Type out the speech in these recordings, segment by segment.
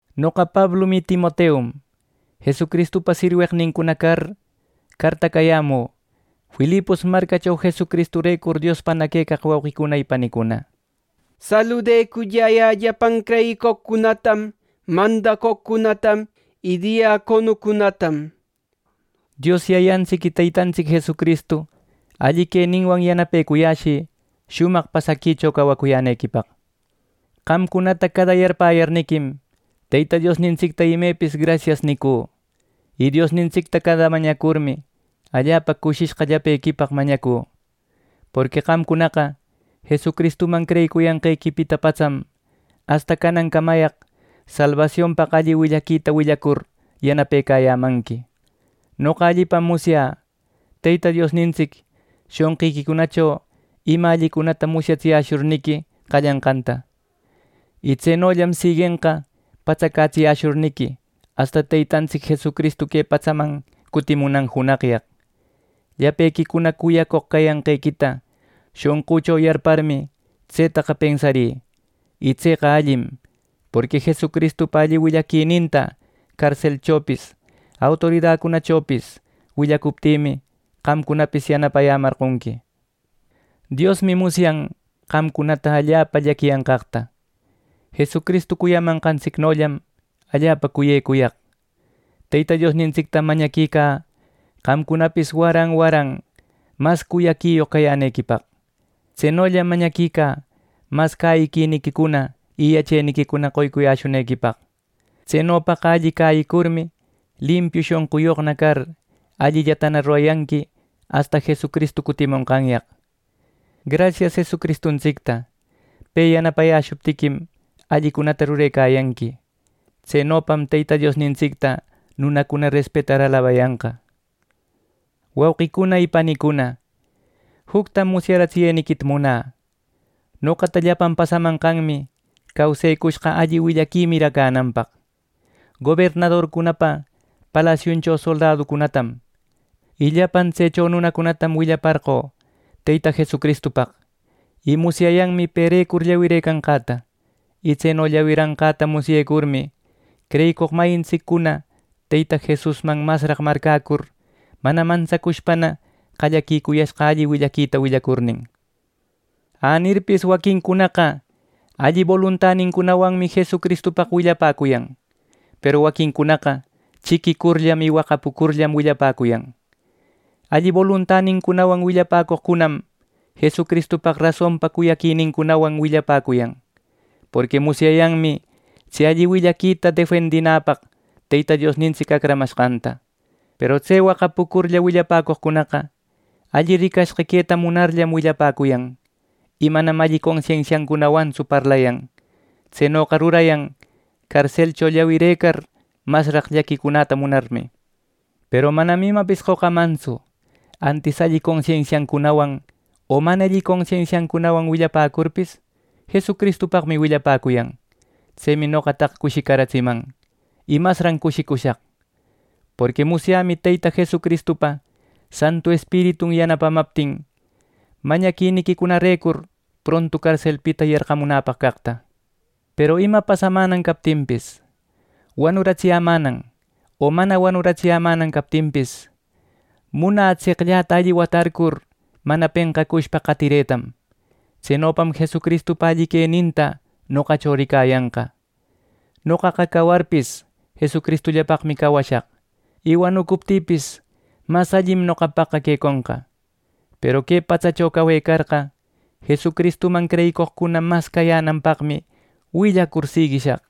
Noqa Pablum y Timoteum, Jesucristupa sirweqnincuna car cartacayämü, Filipos marcacho Jesucristurecur Diospana quecaq wauqicuna, panicuna. Saludeculläyä llapan creyicoqcunatam, mandacoqcunatam y diaconocunatam. Dios Yayantsic y Teytantsic Jesucristu alli queninwan yanapecuyäshï shumaq pasaquicho cawacuyänequipaq. Qamcunata cada yarpäyarniquim Teyta Diosnintsicta imepis “Grasias” nicü; y Diosnintsicta cada mañacurmi, allapa cushishqa llapequipaq mañacü. Porqui qamcunaqa Jesucristuman creyicuriyanqequipita patsam, asta canancamayaq salbasionpaq alli willaquita willacur yanapecayämanqui. Noqa allipam musyä, Teyta Diosnitsic shonqiquicunacho ima allicunata musyatsiyäshurniqui qallanqanta; y tsenollam siguenqa patsacätsiyäshurniqui asta Teytantsic Jesucristu que patsaman cutimunan junaqyaq. Llapequicuna cuyacoq cayanqequita shonqücho yarparmi, tsetaqa pensarï, y tseqa allim. Porqui Jesucristupa alli willaquininta carselchopis, autoridacunachopis willacuptïmi qamcunapis yanapayämarqonqui. Diosmi musyan qamcunata allapa llaquiyanqaqta. Jesucristu cuyamanqantsicnollam allapa cuyecuyaq. Teyta Diosnintsictam mañaquicä qamcunapis waran waran mas cuyaquiyoq cayänequipaq. Tsenollam mañaquicä mas cäyiquiniquicuna, y yacheniquicuna qoycuyäshunequipaq; tsenopaqa alli cäyicurmi, limpiu shonquyoqna car, allillata rurayanqui asta Jesucristu cutimonqanyaq. Grasias Jesucristuntsicta, pe yanapayäshuptiquim, allicunata rurecayanqui. Tsenopam Teyta Diosnintsicta nunacuna respetar alabayanqa. Wauqicuna y panicuna, juctam musyaratsiyeniquita munä: Noqata llapan pasamashqanmi causëcushqa alli willaqui miracänanpaq. Gobernadorpa palasiuncho soldaduncunatam, y llapan tsecho nunacunatam willaparqö Teyta Jesucristupaq, y musyayanmi perecur llawirëcanqäta. Y tseno llawiranqäta musyecurmi, creyicoq mayintsiccuna Teyta Jesusman masraq marcäcur, mana mantsacushpana qallaquicuyashqa alli willaquita willacurnin. Anirpis, waquincunaqa alli boluntanincunawanmi Jesucristupaq willapäcuyan; peru waquincunaqa chiquicurllam y waqapucurllam willapäcuyan. Alli boluntanincunawan willapäcoqcunam Jesucristupaq rasonpa cuyaquinincunawan willapäcuyan; porqui musyayanmi tse alli willaquita defendinäpaq Teyta Diosnintsic acramashqanta. Peru tse waqapucurlla willapäcoqcunaqa, alli ricashqa queta munarllam willapäcuyan, y manam alli consensiancunawantsu parlayan. Tsenoqa rurayan carselcho llawirëcar masraq llaquicunäta munarmi. Peru manam imapis qocamantsu; antis alli consensiancunawan o mana alli consensiancunawan willapäcurpis, Jesucristupaqmi willapäcuyan. Tsemi noqataqa cushicaratsiman, y masran cushicushaq. Porqui musyämi Teyta Jesucristupa Santu Espiritun yanapamaptin, mañaquiniquicunarecur prontu carselpita yarqaramunäpaq caqta. Peru ima pasamänan captinpis, wanuratsiyämänan o mana wanuratsiyämänan captinpis, munä tseqllata alli watarcur mana penqacushpa qatiretam. Tsenopam Jesucristupa alli queninta noqacho ricayanqa. Noqaqa cawarpis, Jesucristullapaqmi cawashaq, y wanucuptïpis, ¡mas allim noqapaqqa queconqa! Peru que patsacho cawecarqa, Jesucristuman creyicoqcuna mas cayänanpaqmi willacur siguishaq.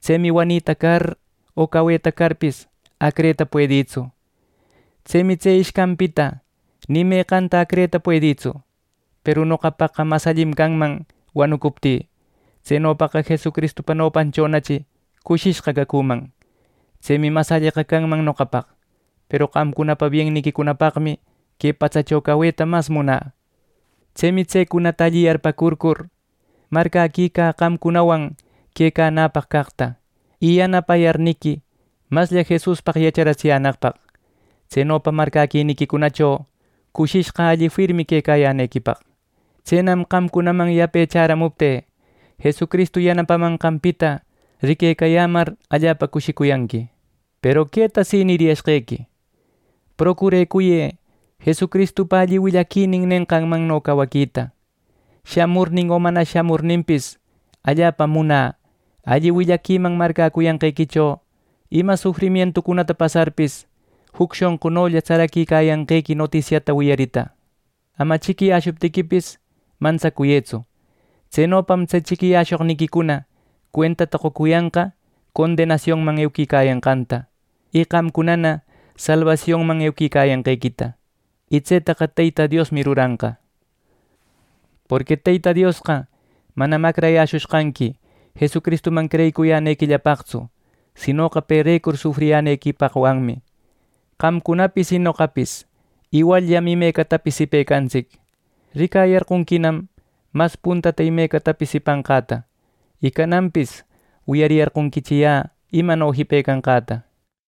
Tsemi wanita car o caweta carpis, acreta puedïtsu. Tsemi tse ishcanpita ni meqanta acreta puedïtsu. Peru noqapaqqa mas allim canman wanucuptï. Tsenopaqa Jesucristupa nopanchonachi cushishqa cacüman. Tsemi mas alleqa canman noqapaq. Peru qamcunapa bienniquicunapaqmi que patsacho caweta mas munä. Tsemi tsecunata alli yarpäcurcur, marcäquicä qamcunawan quecanäpaq caqta, y yanapayarniqui maslla Jesuspaq yachapäratsiyänaqpaq; tsenopa marcäquiniquicunacho cushishqa alli firmi quecayänequipaq. Tsenam qamcunaman yape chäramuptï Jesucristu yanapamanqanpita riquecayämar allapa cushicuyanqui. Peru queta si niriyashqequi: Procurecuyë Jesucristupa alli willaquinin nenqanmanno cawaquita. Shamurnin o mana shamurninpis, allapam munä alli willaquiman marcäcuyanqequicho ima sufrimientucunata pasarpis, juc shonqunolla tsaraquicayanqequi notisiata wiyarita. Ama chiquiyäshuptiquipis mantsacuyëtsu. Tsenopam tse chiquiyäshoqniquicuna cuentata qocuyanqa condenasionman euquicayanqanta, y qamcunana salbasionman euquicayanqequita. Y tsetaqa Teyta Diosmi ruranqa. Porqui Teyta Diosqa manam acrayäshushqanqui Jesucristuman creyicuyänequillapaqtsu, sinoqa perecur sufriyänequipaqwanmi. Qamcunapis y noqapis iwalllam imecatapis jipecantsic. Ricayarqonquinam mas puntata imecatapis jipanqäta, y cananpis wiyariyarqonquichi yä imano jipecanqäta.